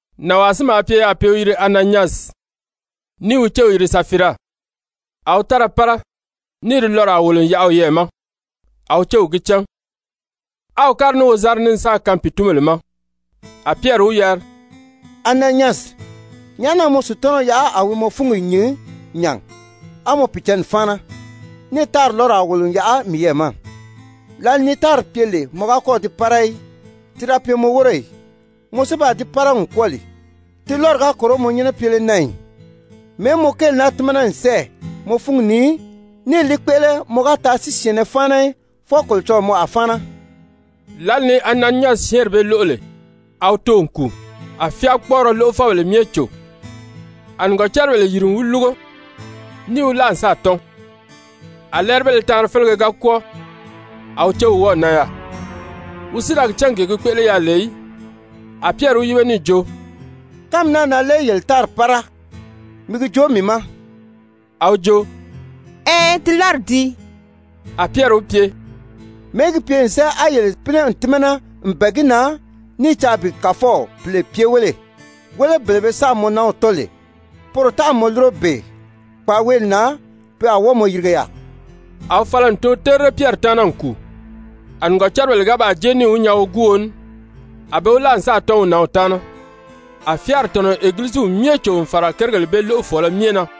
Nànwaa si maa pye yaà pe i wi yiri Ananyasi, ní i wi céw yiri Safira, a wi tára pára níì di lɔraa wòlo n yaʔa wiyɛɛ ma, a wi céw gi cán, á wi kári ní wozanri ní n sáà kaan pìitunbèle ma. A Pyɛri wi yari: «Ananyasi, nyàʔá na mɔ Sutanaw yaʔa a wi mɔ fúngi nyìn nya a mɔ Pìicǎnni fáana, níì tári lɔ́raa wòlo n yaʔa miyɛɛ ma? Lǎli ni tári pye lè mɔ ga kɔ́ɔ̀ di pára í, ti da pye mɔ wóro ì? Mɔ si baa di pára n kwɔ́ɔ lè, ti lɔ́ri ga kòro mɔ nyɛ́nɛ pyele na ì? Mɛ̀ɛ́ mɔ kéeli naa tímana n sɛ́ɛ mɔ fúngi ni níì li kpéʔele? Mɔ ga taa si syɛ̀ɛnnɛ fáana í, fwɔɔ Kolocɔlɔɔ mɔ a fáana.» Lǎli ni Ananyasi syɛ́ɛnri bee lóʔo lè, a wi too n kùu. A fyáakpɔɔrɔ lóʔofɔbèle myɛ cò. A nìgɔcaribèle yìri n wi lúgo, níì wi láa n sáà tɔ́n. A lɛ́ɛribéle taanri félege ga kwɔ́ɔ, a wi céw wɔ́ɔ̀ nan yaà, wi si da gi cán gee gi kpéʔele yaà lè í. A Pyɛri wi yíbe níì jo: «Kánmi naa na lé yele tári pára? Mi gi joo mii ma.» A wi jo: «Ɛɛn, ti lɔ́ri dii.» A Pyɛri wi pye: «Mɛ̀ɛ́ gi pye n sɛ́ɛ á yele pínɛ n tímana n bɛ̀ɛ gi na ní i caa bi Kàfɔw Pìle pye wéle? Wéle, bele be sáà mɔ nanw tɔ́n lè, poro tánʔami mɔ lúro bee kpaaweeli na. Pe a wɔ́ɔ mɔ yirige yaà.» A wi fala n too terire Pyɛri taana n kùu. A nìgɔcaribèle ga baa jée níì wi nyaa woguuo ní, a be wi láa n sáà tɔ́n wi nǎnw taana. A fyáari tɔ̀nɔ n Egiliziw myɛ cò n fàra kérigèle bee lóʔofɔɔlɔ myɛ na.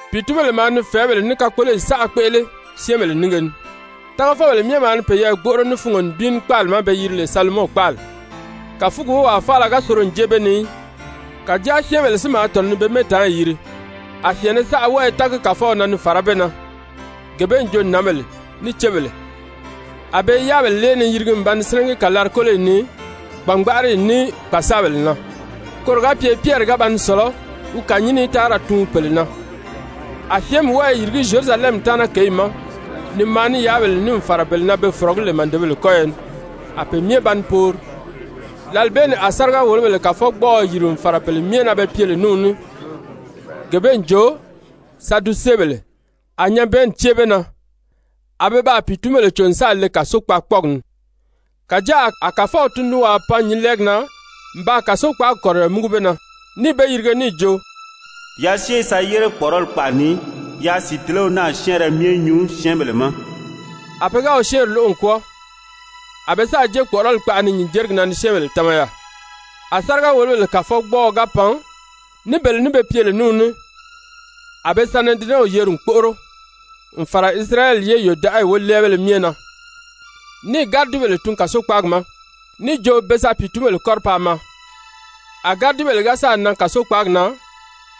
Pìitunbèle maa ni fɛ̀ɛ́bèle ní kakpoloyi saʔa kpéʔele syɛ́ɛnbèle nínge ni. Tágafɔbèle myɛ maa ni peyɛɛ gbóʔoro ní fungo nibin ní kpáali ma be yiri lè Salomɔn kpáali. Kàfugi wówaa faala ga soro n jée be ni í. Kàjáa syɛ́ɛnbèle si maa tɔ̀nɔ ni be mɛ́ɛtaanyi yiri. A syɛɛnmɛ saʔa wɔ́ɔ i tági Kàfɔw na ni fàrá be na, gee bee n jo nǎnbèle ní cébèle. A be i yáabèle lée ni yirigi n ba ni sínɛgi kàlari-kóloyi ni gbàngbaʔariyi ní kpàsaabèle na, koro ga pye Pyɛri ga ba ni sɔ̀lɔ́ wi kànyinni í taa ra tuun pèle na. A syɛ́ɛnmi wɔ́ɔ i yìrigí Zyerusalɛmi taana kěyi ma ni maa ní yáabèle ní n fàra bele na be fɔ̀rɔgí lè màdebèle kɔ́yɔ ni. A pe myɛ ba ni poori. Lǎli bee ni a sáriga-wòlobèle kàfɔgbɔɔɔ yìri n fàra bele myɛ na be pye lè ní wi ní, gee bee n jo Sadusebèle, a nyabɛɛnni cée be na, a be baa pìitunbèle cò n sáà le kàsokpaakpɔɔgi ni. Kàjáa a Kàfɔw tundunwaa pan nyǐnlɛɛgi na n baa kàsokpaagi kɔ̀riyɔ múgu be na, níì be yirige níì jo: «Yaa syée ye sa yére kpɔ̀ʔɔrɔli kpaʔa ni, yaa sìitelew naa syɛ́ɛnrɛ myɛ nyuu syɛ́ɛnbèle ma.» A pe ga wi syɛ́ɛnri lóʔo n kwɔ́ɔ, a be sáà jée kpɔ̀ʔɔrɔli kpaʔa ni nyǐnjerigi na ni syɛ́ɛnbèle tama yaà. A sáriga-wòlobèle kàfɔgbɔɔɔ ga pan ní bele ní be pye lè ní wi ní, a be Sanedirɛnw yeri n kpóʔoro n fàra Isirayɛli ye yòdaʔayi wólɛɛbéle myɛ na. Níì gáridibèle tun kàsokpaagi ma níì jo be sa pìitunbèle kɔ́ri paa maa. A gáridibèle ga sáà nan kàsokpaagi na,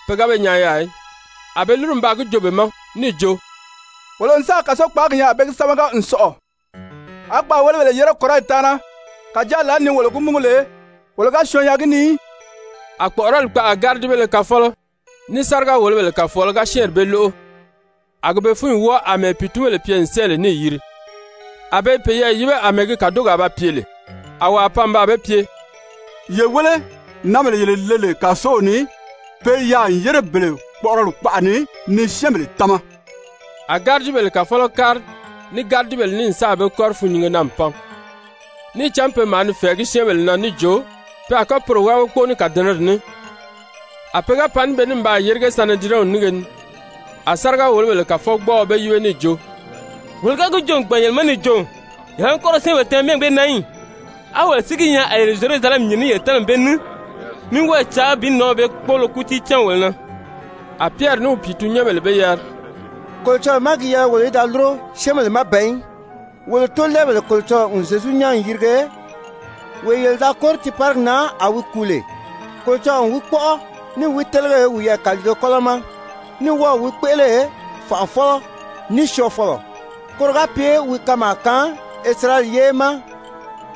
pe ga be nyaa yaà í. A be lúru n baa gi joo be ma níì jo: «Wolo n sáà kàsokpaagi nyaa a be gi sámaga n sɔ̀ʔɔ, á kpaàwelebèle yére kɔ̀riyi taana, kàjáa lǎli ni wolo gi múgu lè, wolo ga syɔɔn nyaa gi ni í.» A kpɔ̀ʔɔrɔli kpaʔa gáridibéle kafɔlɔ ní sáriga-wòlobèle kàfɔɔlɔ ga syɛ́ɛnri bee lóʔo, a gi be fúnyi wɔ́ɔ àmɛɛ pìitunbèle pye n sɛ́ɛ lè níì yiri, a be i peyɛɛ yíbe àmɛɛ gi kàdogi a ba pye lè. A wàa pan n baa be pye: «Ye wéle, nǎnbèle yele le lè kàsow ni, pe i yaà n yére bele kpɔ̀ʔɔrɔli kpaʔa ni ni syɛ́ɛnbèle tama.» A gáridibèle kàfɔlɔ kári ní gáridibèle ní n sáà be kɔ́ri fûnnyinge na n pan, níì cán pe maa ni fɛ̀ɛgí syɛ́ɛnbèle na níì jo pe a kɔ́ poro wábagi kpóo ní kàdɛnɛrɛ ní. A pe ga pan ní be ní n baa yérige Sanedirɛnw nínge ni, a sáriga-wòlobèle kàfɔgbɔɔɔ be yíbe níì jo: «Wolo ga gi joo n gbàn yele ma níì jo: Yele a ní kɔ́ ra syɛ́ɛnbèle tama mɛ́ɛgi bee na í ì? A wolo si gi nyaa a yele Zyerusalɛmi nyìn ní yele tamani bee ní, ní wɔ́ɔ i caa bi nǎnw bee kpóolo kútii cáan wolo na.» A Pyɛri ní wi pìitunnyɛnbèle be yari: «Kolocɔlɔɔ má gi yɛlɛ wolo í da lúro, syɛ́ɛnbèle má ban í. Wolo tóolɛɛbèle Kolocɔlɔɔ n Zyezu nyán n yìrige, wee yele da kóri tiiparigi na a wi kùu lè. Kolocɔlɔɔ n wi kpɔ́ʔɔ, níì wi télege wiyɛɛ kàliige kɔ́lɔ ma, ní wɔ́ɔ̀ wi kpéʔele Fànʔafɔlɔ ní Syɔɔfɔlɔ, koro ga pye wi kanmaa kaan Isirayɛli ye ma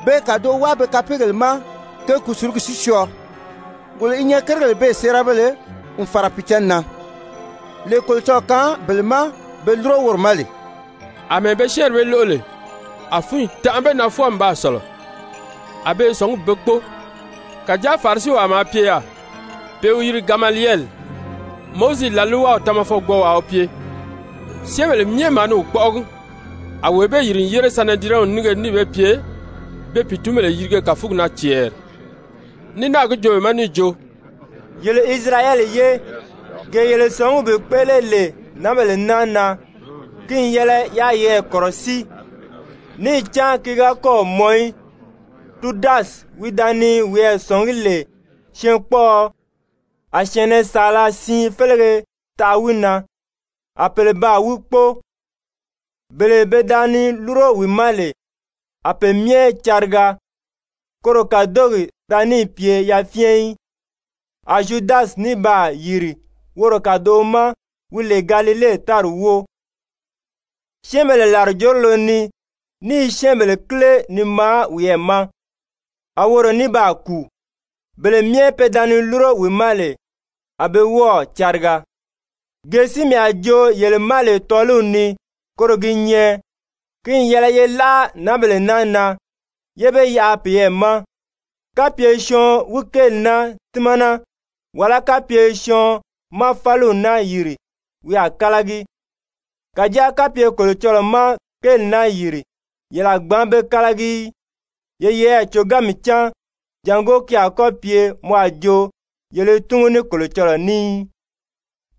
be kàdoʔo wáa be kapeegèle ma ge kùsulugi si syɔɔ. Wolo si i nyɛ kérigèle bee séerabéle n fàra Pìicǎnni na, lee Kolocɔlɔɔ kaan bele ma be lúro woro ma lè.» Amɛɛ be syɛ́ɛnri bee lóʔo lè, a fúnyi tanʔa be na fwɔɔ n baa sɔ̀lɔ, a be i sɔ̀ngí bi be kpóo. Kàjáa Farisiwaa maa pye yaà pe i wi yiri Gamaliyɛli, Mowizi làlwaw tamafɔgbɔɔwaa wi pye, syɛ́ɛnbèle myɛ maa ni wi kpɔ́ʔɔgi, a wee bee yìri n yére Sanedirɛnw nínge ni níì be pye be pìitunbèle yirige kàfugi na cɛɛri, ní náà gi joo be ma níì jo: «Yele Isirayɛli ye, gee yele sɔ̀ngí bi kpéʔele lè nǎnbèle naa na, ki n yɛlɛ yaa yeyɛɛ kɔ̀rɔsíi. Níì cán ki ga kɔ́ɔ̀ mɔn í, Tudasi wi da ni wiyɛɛ zɔ̀ngí lè syɛɛnkpɔɔɔ, a syɛ̀ɛnnɛ saala siin félege taʔa wi na, á pèle baa wi kpóo. Bele pe da ni lúro wi ma lè, a pe myɛ cariga, koro kàdogi da níì pye yafyɛn í. A Zyudasi ní baa yìri woro kàdoʔo ma, wi lè Galile tári wóo, syɛ́ɛnbèle làrijorolo ni, ní i syɛ́ɛnbèle kíle ni maa wiyɛɛ ma, a woro ní baa kùu, bele myɛ pe da ni lúro wi ma lè, a be wɔ́ɔ̀ cariga. Gee si mii a joo yele ma lè tɔ́ɔliw ni koro gi nyɛ, ki n yɛlɛ ye láʔa nǎnbèle naa na, yé be yaʔa peyɛɛ ma. Kapye syɔɔn wi kéeli naa tímana, wàlá kapye syɔɔn má fáliw naa yìri, wi a kálagi. Kàjáa kapye Kolocɔlɔɔ má kéeli naa yìri, yele a gbǎn be kálagi í. Ye yeyɛɛ còganmi cán jàngó ki a kɔ́ pye mɔ a jo yele i túngu ní Kolocɔlɔɔ ní í.»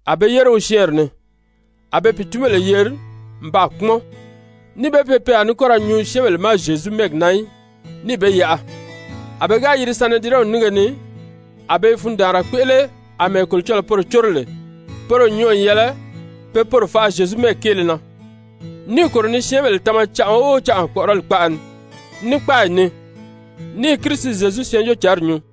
A be yére wi syɛ́ɛnri ni. A be pìitunbèle yeri n baa kpúmɔn, níì be pye pe a ní kɔ ra nyuu syɛ́ɛnbèle ma Zyezu mɛ́ɛgi na í, níì be yaʔa. A pe ga yiri Sanedirɛnw nínge ni, a be i fundaanra kpéʔele àmɛɛ Kolocɔlɔɔ poro córo lè poro n nyɔɔ n yɛlɛ pe poro faʔa Zyezu mɛ́ɛgi kéele na. Níì kòro ni syɛ́ɛnbèle tama canʔa o canʔa kpɔ̀ʔɔrɔli kpaʔa ni, ní kpáayi ni, ní i Kirisi Zyezu Syɛɛnjóocǎnri nyuu.